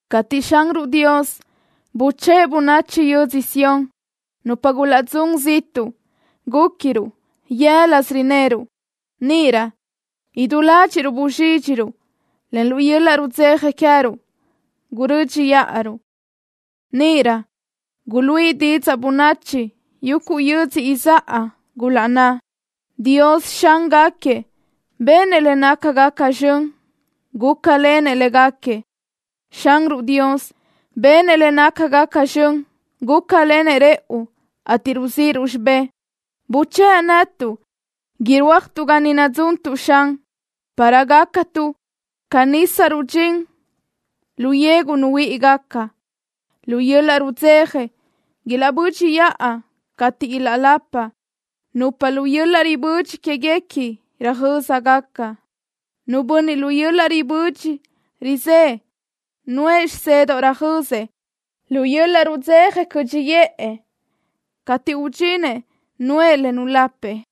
Cateʼ Xanruʼ Dios buchë́ʼë bönachi yödzö Sión nupa gulaʼdzún ziʼtuʼ, gúquiruʼ yë́lasö rineruʼ. Níʼirö idú ládxiʼruʼ buzxídxiruʼ, en lu yöl-laʼ rudzeja queë́ruʼ gurö́dxiʼaruʼ. Níʼirö guluíʼi didzaʼ bönachi yuguʼ yödzö izáʼa, gulaʼnná: “Dios, Xángaquiëʼ, benëʼ le nácagaca zxön, gúcalenëʼ légaquiëʼ.” Xanruʼ Dios benëʼ le nácagaca zxön, gúcalenëʼ rëʼu, ateʼ ruzíʼiruʼ xibë́ʼ. Buchë́ʼ netuʼ, irúajtuʼ ga ni nadzuntuʼ, Xan, para gácatuʼ ca nisa rudxín lu yegu nuhuíʼigaca. Lu yöl-laʼ rudzeja ilaʼbö́dxiʼa cateʼ ilaʼlapa nupa lu yöl-laʼ ribödxi quéguequi röjö́zagaca. Nu bönniʼ lu yöl-laʼ ribödxi rizë́ʼë, nuʼë bínnedoʼ röjözëʼ, lu yöl-laʼ rudzeja cö́dxiʼë cateʼ udxinëʼ, nuʼë le nulapëʼ.